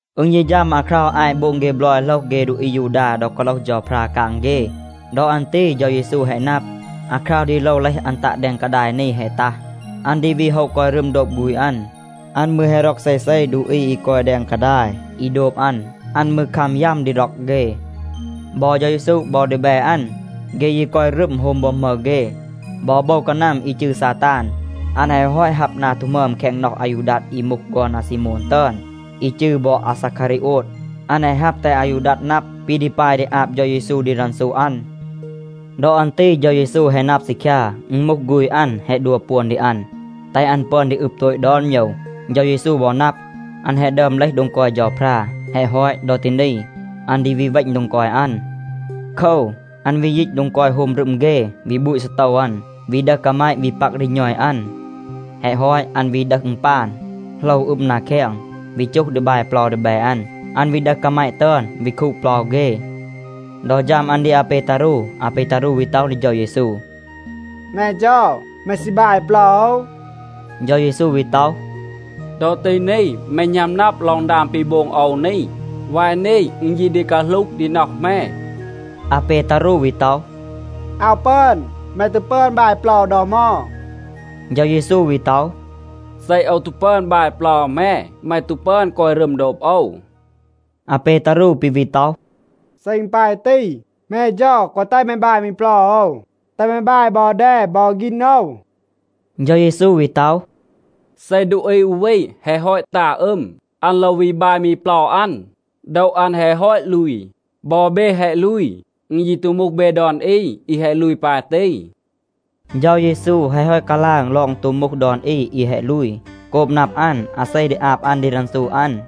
อึณ ยี ฌัม อาคราว อาต โบง เฆ บลอย โหลห เฆ ดูอี อายูดา ดอ กาโลห เฌาพรา กาง เฆ. ดอ อัน ตี เฌา เยซู แฮะ นับ, อาคราว ดี โลว เลห อัน ตัะ แดง กาดาย นี แฮะ ตัห. อัน ดี วี โฮะ กอย รึม โดบ ฆูณ อัน. อัน มืร แฮะ ร็อก เซเซ ดูอี อี กอย แดง กาดาย, อี โดบ อัน. อัน มืร คัม ยัม ดี ร็อก เฆ. บอ เฌา เยซู บอ ดีแบ อัน, เฆ ยี กอย รึม โฮม โบม หมึร เฆ. บอ โบว กานัม อี จืร ซาตาน, อัน แฮะ ฮอต ฮับ นา ตู หมึอม แคง น็อห อายูดัด อี มูห ฆอน อาซีโมน ตึอน, อี จืร บอ อาซาคารีโอด. อัน แฮะ ฮับ แตห อายูดัด นับ, ปี ดี ปาย ดี อาบ เฌา เยซู ดี รันซู อัน. ดอ อัน ตี เฌา เยซู แฮะ นับ ซีคยา, อึณ มูห ฆูณ อัน แฮะ ดัว ปวน ดี อัน, แตห อัน ปึอน ดี อึบ โตต ดอน โมยว. เฌา เยซู บอ นับ, อัน แฮะ ดึอม เลห โดง กอย เฌาพรา. แฮะ ฮอต, ดอ ตี นี, อัน ดี วี เวณ โดง กอย อัน. โคว, อัน วี ยีต โดง กอย โฮม รึม เฆ, วี บูต ซีโตว อัน, วี ดึห กาแมะ วี ปัก ดี ณอย อัน. แฮะ ฮอต, อัน วี ดึห อึณปาน, โหลว อึม นา แคง, วี จูห ดี บาย เปลา ดีแบ อัน. อัน วี ดึห กาแมะ ตึอน, วี คูด เปลา เฆ. ดอ ฌัม อัน ดี อาเปตารู, อาเปตารู วี ต็อห ดี เฌา เยซู, “แม เฌา, แม ซี บาย เปลา โอว?” เฌา เยซู วี ต็อห, “ดอ ตี นี, แม หณัม นับ ลอง ดาง ปี โบง โอว นี. วาย นี, อึณ ยี ดี กาหลูห ดี น็อห แม.” อาเปตารู วี ต็อห, “อาว ปึอน. แม ตู ปึอน บาย เปลา โอว ดอ เหมา.” เฌา เยซู วี ต็อห, “เซ โอว ตู ปึอน บาย เปลา แม, แม ตู ปึอน กอย รึม โดบ โอว.” อาเปตารู ปี วี ต็อห, “เซ อึณ ปาย ตี, แม เฌา, แกวะ แตห แม บาย มี เปลา โอว. แตห แม บาย บอ แด บอ ฆีณ โอว.” เฌา เยซู วี ต็อห, “เซ ดูอี อู วี แฮะ ฮอต ตา อึม, อัน โลว วี บาย มี เปลา อัน. โดว อัน แฮะ ฮอต ลูย. บอ เบ แฮะ ลูย. อึณ ยี ตู มูห เบ ดอน อี อี แฮะ ลูย ปาย ตี.” เฌา เยซู แฮะ ฮอต กาลาง ลอง ตู มูห ดอน อี อี แฮะ ลูย, โกบ นับ อัน อาเซ ดี อาบ อัน ดี รันซู อัน.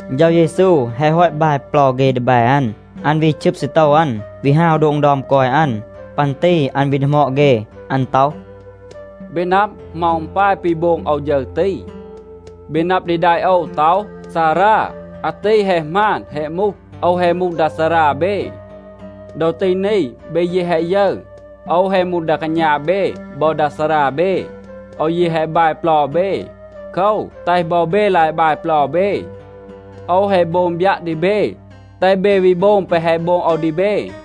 เฌา เยซู แฮะ ฮอต บาย เปลา เฆ ดีแบ อัน, อัน วี ชึบ ซีโตว อัน, วี ฮาว โดง ดึอม กอย อัน. ปัน ตี อัน วี ดีหมอด เฆ, อัน ต็อห, “เบ นับ, เหมา อึณ ปาย ปี โบง โอว ฌึร ตี? เบ นับ ดี แดะ โอว ต็อห, ‘ซารา.’ อาตี แฮะ หมาน แฮะ มูห. โอว แฮะ มูห ดา ซารา เบ. ดอ ตี นี, เบ ยี แฮะ ยึร, โอว แฮะ มูห ดา กาณา เบ บอ ดา ซารา เบ, โอว ยี แฮะ บาย เปลา เบ. โคว, แตห บอ เบ ลาย บาย เปลา เบ. โอว แฮะ โบง บยัะ ดี เบ, แตห เบ วี โบง แปะ แฮะ โบง โอว ดี เบ.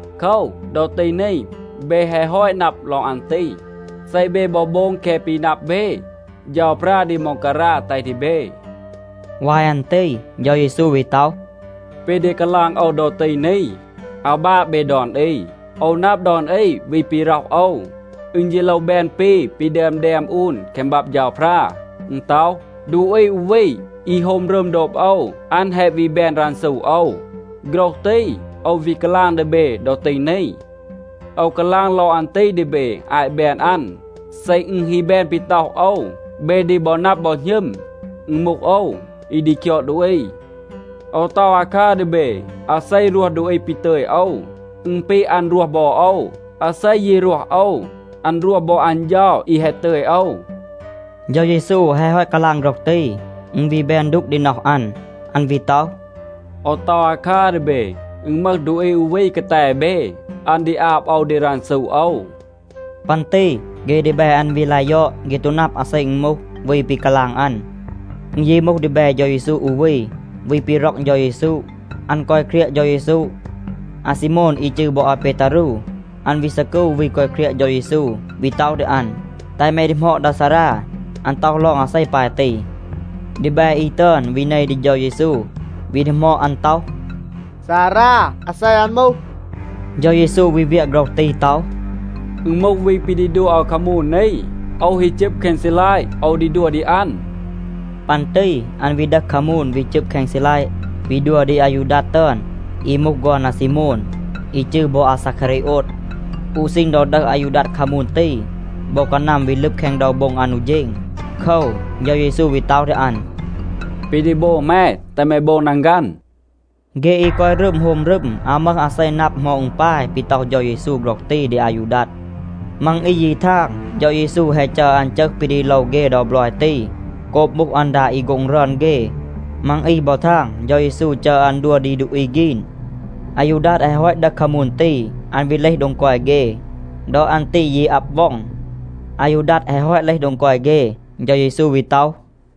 โคว, ดอ ตี นี, เบ แฮะ ฮอต นับ ลอง อัน ตี. เซ เบ บอ โบง แคะ ปี นับ เบ, เฌาพรา ดี ม็องการา แตห ดี เบ.” วาย อัน ตี เฌา เยซู วี ต็อห, “ปี ดี กาลาง โอว ดอ ตี นี, อาว บาะ เบ ดอน อี. โอว นับ ดอน อี วี ปี ร็อห โอว. อึณ ยี โลว แบน ปี ปี ดึอม แดม อูน แคง บับ เฌาพรา. อึณ ต็อห, ‘ดูอี อู วี, อี โฮม รึม โดบ โอว, อัน แฮะ วี แบน รันซู โอว.’ โฆรห ตี โอว วี กาลาง ดี เบ ดอ ตี นี. โอว กาลาง ลอง อัน ตี ดี เบ อาต แบน อัน. เซ อึณ ฮี แบน ปี ต็อห โอว, เบ ดี บอ นับ บอ หณึม, อึณ มูห โอว, อี ดี คยอด ดูอี. โอว ต็อห อาคัร ดี เบ, อาเซ รวห ดูอี ปี ตึย โอว, อึณ ปี อัน รวห บอ โอว. อาเซ ยี รวห โอว, อัน รวห บอ อัน เฌา อี แฮะ ตึย โอว.” เฌา เยซู แฮะ ฮอต กาลาง โฆรห ตี, อึณ วี แบน ดูก ดี น็อห อัน. อัน วี ต็อห, “โอว ต็อห อาคัร ดี เบ. อึณ มึห ดูอี อู วี กาแต เบ, อัน ดี อาบ โอว ดี รันซู โอว.” ปัน ตี เฆ ดีแบ อัน วี ลาย ยอด. เฆ ตู นับ อาเซ อึณ มูห, วี ปี กาลาง อัน. อึณ ยี มูห ดีแบ เฌา เยซู อู วี, วี ปี ร็อก เฌา เยซู. อัน กอย เครียะ เฌา เยซู. อาซีโมน, อี จืร บอ อาเปตารู, อัน วี ซีกู วี กอย เครียะ เฌา เยซู วี ต็อห ดี อัน, “แตห แม ดีหมอด ดา ซารา, อัน ต็อห ลอง อาเซ ปาย ตี.” ดีแบ อี ตึอน วี เน ดี เฌา เยซู, วี ดีหมอด อัน ต็อห, “ซารา, อาเซ อัน มูห?” เฌา เยซู วี เวียะ โฆรห ตี ต็อห, “อึณ มูห วี ปี ดี ดัว โอว คามูน นี. โอว ฮี จึบ แคง ซีลัยะ, โอว ดี ดัว ดี อัน.” ปัน ตี อัน วี ดึห คามูน, วี จึบ แคง ซีลัยะ, วี ดัว ดี อายูดัด ตึอน, อี มูห ฆอน อาซีโมน, อี จืร บอ อาซาคารีโอด. อู ซีณ ดอ ดึห อายูดัด คามูน ตี, โบว กานัม วี ลึบ แคง โดว โบ็ง อัน อู เฌณ. โคว, เฌา เยซู วี ต็อห ดี อัน, “ปี ดี โบง แม, แตห แม โบง นังฆัน.” เฆ อี กอย รึม โฮม รึม, อาว มึห อาเซ นับ เหมา อึณ ปาย ปี ต็อห เฌา เยซู โฆรห ตี ดี อายูดัด. มัง อี ยี ทาง, เฌา เยซู แฮะ จัร อัน จึห ปี ดี โลว เฆ ดอ บลอย ตี โกบ มูห อัน ดา อี โฆ็ง รึอน เฆ. มัง อี บอ ทาง, เฌา เยซู จัร อัน ดัว ดี ดูอี ฆีน. อายูดัด แฮะ ฮอต ดึห คามูน ตี, อัน วี เลห โดง กอย เฆ. ดอ อัน ตี ยี อับ ว็อง. อายูดัด แฮะ ฮอต เลห โดง กอย เฆ, เฌา เยซู วี ต็อห,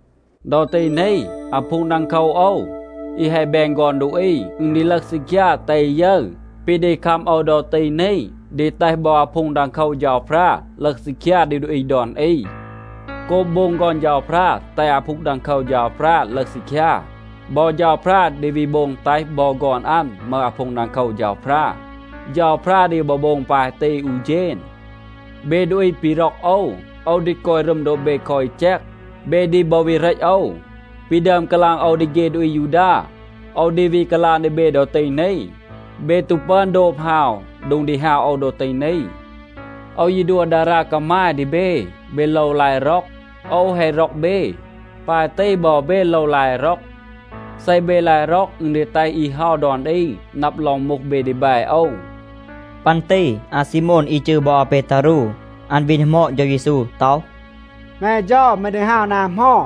“ดอ ตี นี, อาพูง ดังโคว โอว, อี แฮะ แบน ฆอน ดูอี, อึณ ดี ลึห ซีคยา, แตห อี ยึร. ปี ดี คัม โอว ดอ ตี นี ดี แตห บอ อาพูง ดังโคว เฌาพรา ลึห ซีคยา ดี ดูอี ดอน อี. โกบ โบง ฆอน เฌาพรา แตห อาพูง ดังโคว เฌาพรา ลึห ซีคยา, บอ เฌาพรา ดี วี โบง แตห บอ ฆอน อัน มึห อาพูง ดังโคว เฌาพรา. เฌาพรา ดี บอ โบง ปาย ตี อู เฌณ. เบ ดูอี ปี ร็อก โอว, โอว ดี กอย รึม โดบ เบ คอ อี แจก. เบ ดี บอ วี เหรต โอว. ปี ดึอม กาลาง โอว ดี เฆ ดูอี อายูดา, โอว ดี วี กาลาง ดี เบ ดอ ตี นี, เบ ตู ปึอน โดบ ฮาว โดง ดี ฮาว โอว ดอ ตี นี. โอว ยี ดัว ดารา กามาย ดี เบ. เบ โลว ลาย ร็อก. โอว แฮะ ร็อก เบ. ปาย ตี บอ เบ โลว ลาย ร็อก. เซ เบ ลาย ร็อก, อึณ ดี แตห อี เฮา ดอน อี นับ ลอง มูห เบ ดีแบ โอว.” ปัน ตี อาซีโมน, อี จืร บอ อาเปตารู, อัน วี ดีหมอด เฌา เยซู ต็อห, “แม เฌา, แม ดี ฮาว นา เหมา?”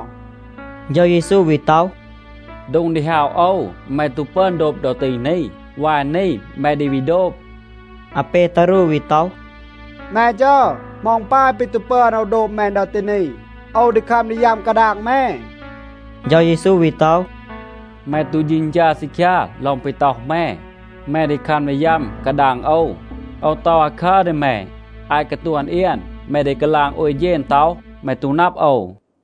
เฌา เยซู วี ต็อห, “โดง ดี ฮาว โอว, แม ตู ปึอน โดบ ดอ ตี นี. วาย นี, แม ดี วี โดบ.” อาเปตารู วี ต็อห, “แม เฌา, เหมา อึณ ปาย ปี ตู ปึอน โอว โดบ แม ดอ ตี นี? โอว ดี คัม ดี ยัม กาดาง แม.” เฌา เยซู วี ต็อห, “แม ตู เฌณฌา ซีคยา ลอง ปี ต็อห แม, แม ดี คัม ดี ยัม กาดาง โอว. โอว ต็อห อาคัร ดี แม. อาต กาตวน เอียน, แม ดี กาลาง โอย เฌณ ต็อห, แม ตู นับ โอว.”